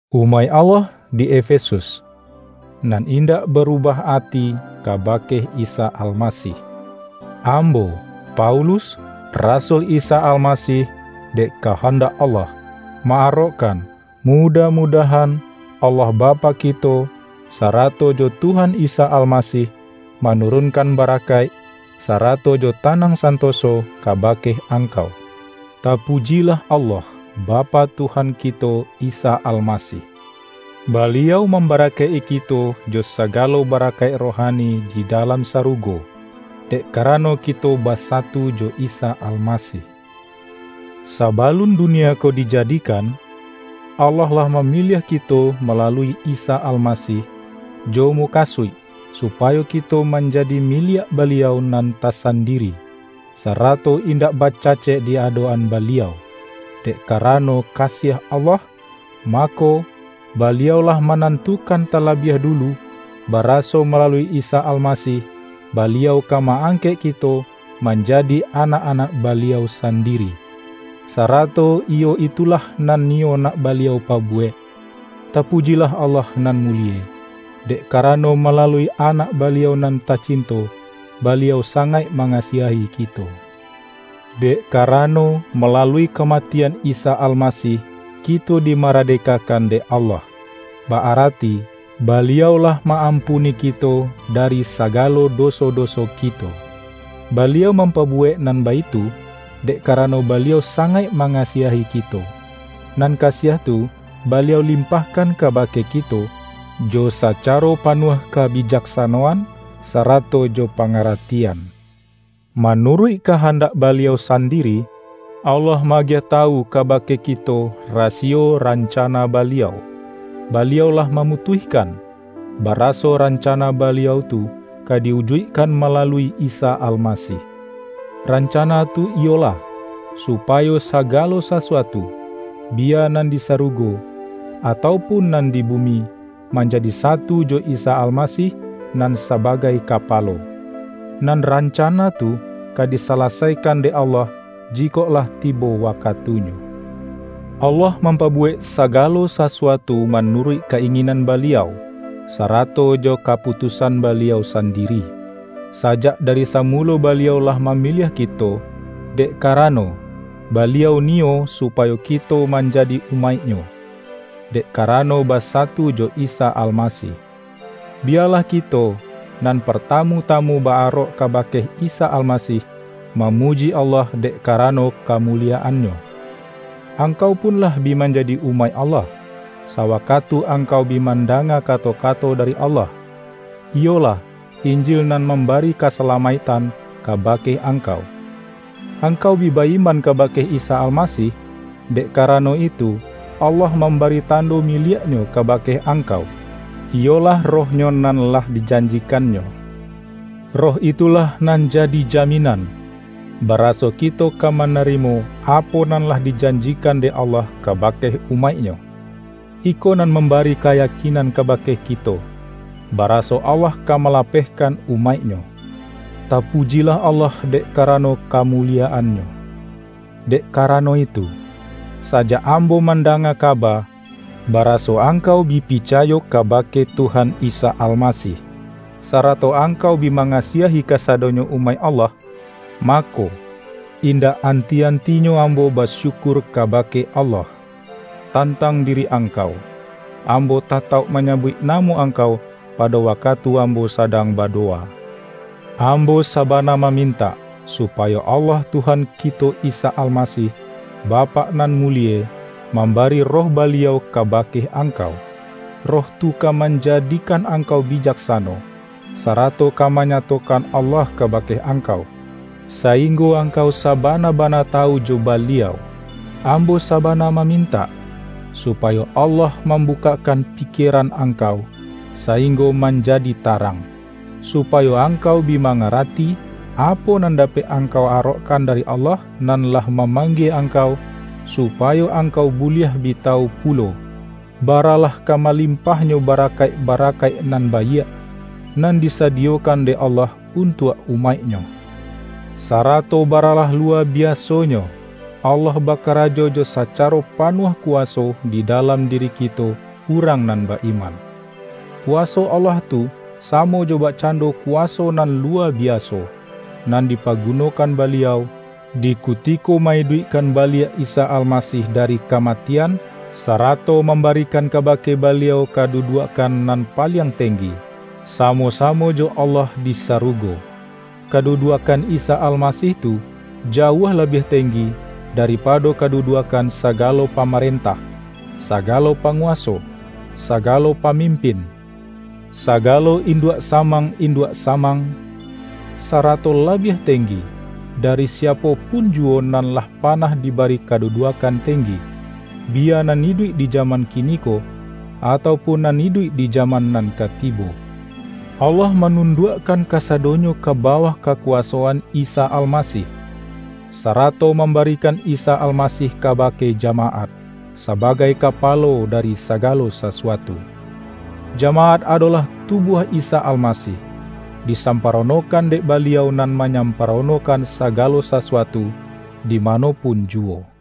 Umaik Allah di Efesus, nan indak barubah ati kabake Isa Almasih! Ambo, Paulus, rasul Isa Almasih dek kahandak Allah, ma-arokkan, mu-dah-mudahan Allah Bapak kito, sara-to jo Tuhan Isa Almasih, manurunkan barakaik, sarato jo tanang santoso ka-bake angkau. Tapujilah Allah, Bapak Tuhan ki-to Isa Almasih! Baliau mambarakaik-i kito jo saga-lo barakaik rohani di dalam sarugo, dek karano kito basatu jo Isa Almasih. Sabalun dunia ko dijadikan, Allah lah mamiliah kito malalui Isa Almasih, jo mukasuik supayo kito manjadi miliak Baliau nan tasandiri, sarato indak ba-cacek di adok-an Baliau. Dek karano kasiah Allah, mako, Baliau lah ma-nantukan talabiah dulu, baraso malalui Isa Almasih, Baliau ka ma-angkek kito manjadi anak-anak Baliau sandiri. Sa-rato iyo itulah nan niyo nak Baliau pa-buwek. Tapujilah Allah nan mulie, dek karano malalui Anak Baliau nan tacinto, Baliau sangaik mangasiahi kito. Dek karano, malalui kamatian Isa Almasih, kito dimaradekakan dek Allah, ba-arati Baliau lah ma-am-puni kito dari sagalo doso-doso kito. Baliau mampabuwek nan baitu, dek karano Baliau sangaik mangasiahi kito, nan kasiah tu Baliau limpahkan kaba-ke kito, jo sacaro panuah kabijaksano-an, sarato jo pangaratian. Manuruik kahandak Baliau sandiri, Allah ma-agiah tawu kabake kito rasiyo rancana Baliau; Baliau lah mamutuihkan, baraso rancana Baliau tu ka di-ujuik-kan malalui Isa Almasih. Rancana tu iyolah, supayo sagalo sasuatu, bi-ya nan di sarugo atau pun nan di bu-mi, manjadi satu jo Isa Almasih nan sabagai Kapalo. Nan rancana tu ka disalasaikan dek Allah jikok lah tibo wakatunyo. Allah mampabuwek sagalo sasu-atu manuruik ka-inginan Baliau, sarato jo kaputusan Baliau sandiri. Sajak dari samulo Baliau lah mamiliah kito, dek karano, Baliau niyo supayo kito man-jadi umaik-Nyo, dek karano basatu jo Isa Almasih. Biyalah kito, nan par-tamu-tamu ba-arok kabake Isa Alma-sih, mamuji Allah dek karano kamuli-yaan-Nyo! Angkau pun lah bi manjadi umaik Allah, sawakatu angkau bi mandanga ka-to-kato dari Allah, iyolah Injil nan mam-bari kasalamaiktan kabake angkau. Ang-kau bi ba-iman kabake Isa Almasih, dek karano itu Allah mambari tando miliak Nyo kabake angkau, iyolah Roh-Nyo nan lah dijanjikan-Nyo. Roh itulah nan ja-di jaminan, baraso kito ka manarimo apo nan lah dijanjikan dek Allah kabake umaik-Nyo. Iko nan mambari kayakinan kabake kito, baraso Allah ka malapehkan umaik-Nyo. Tapujilah Allah dek karano kamuliyaan-Nyo! Dek karano itu, sajak ambo man-danga kaba, baraso angkau bi picayo kabake Tuhan Isa Almasih, sarato ang-kau bi mangasiahi kasadonyo umaik Allah, mako, indak anti-antinyo ambo basyukur kabake Allah, tantang diri angkau. Ambo tatauk manyabuik namo angkau pado wakatu ambo sadang ba-dowa. Ambo sabana mamintak, supa-yo Allah Tuhan kito Isa Almasih, Bapak nan mulie, mambari Roh Baliau kabake angkau. Roh tu ka manjadikan angkau bijaksano, sarato ka manyatokan Allah kabake angkau, sainggo angkau saba-na-bana tawu jo Baliau. Ambo sabana mamintak, supayo Allah mambukak-kan pikieran angkau, sainggo manja-di tarang; supayo angkau bi mangara-ti, apo nan dapek angkau arokkan dari Allah nan lah mamanggie angkau. Su-payo angkau buliah bi tawu pulo, ba-ralah ka malimpahnyo barakaik-bara-kaik nan baiak, nan disadiyokan dek Allah untuak umaik-Nyo; sarato ba-ralah luwa biasonyo, Allah bakarajo jo sacaro panuah kuwaso di dalam diri ki-to urang nan ba-iman. Kuwaso Allah tu samo jo bakcando kuwaso nan luwa bi-aso, nan dipagunokan Baliau, di kuti-ko ma-iduikkan baliak Isa Almasih dari kamatian, sarato mambarikan kabake Baliau kaduduakkan nan paliang teng-gi, samo-samo jo Allah di sarugo. Kaduduakkan Isa Almasih tu, jauah labiah tenggi daripado kaduduakkan sa-galo pamarentah, sagalo panguwaso, sa-galo pamimpin, sagalo induak-samang induak-samang, sarato labiah tenggi, dari siapo pun juwo nan lah panah diba-ri kaduduakkan tenggi; biya nan iduik di jaman kiniko, atau pun nan iduik di ja-man nan ka tibo. Allah manunduak-kan kasadonyo ka bawah kakuwaso-an Isa Almasih, sarato mambarikan Isa Almasih kabake jamaat, sabagai Kapa-lo dari sagalo sasuatu. Jamaat adolah tubuah Isa Almasih, disamparonokan dek Baliau nan manyamparonokan sa-galo sasuatu, di mano pun juwo.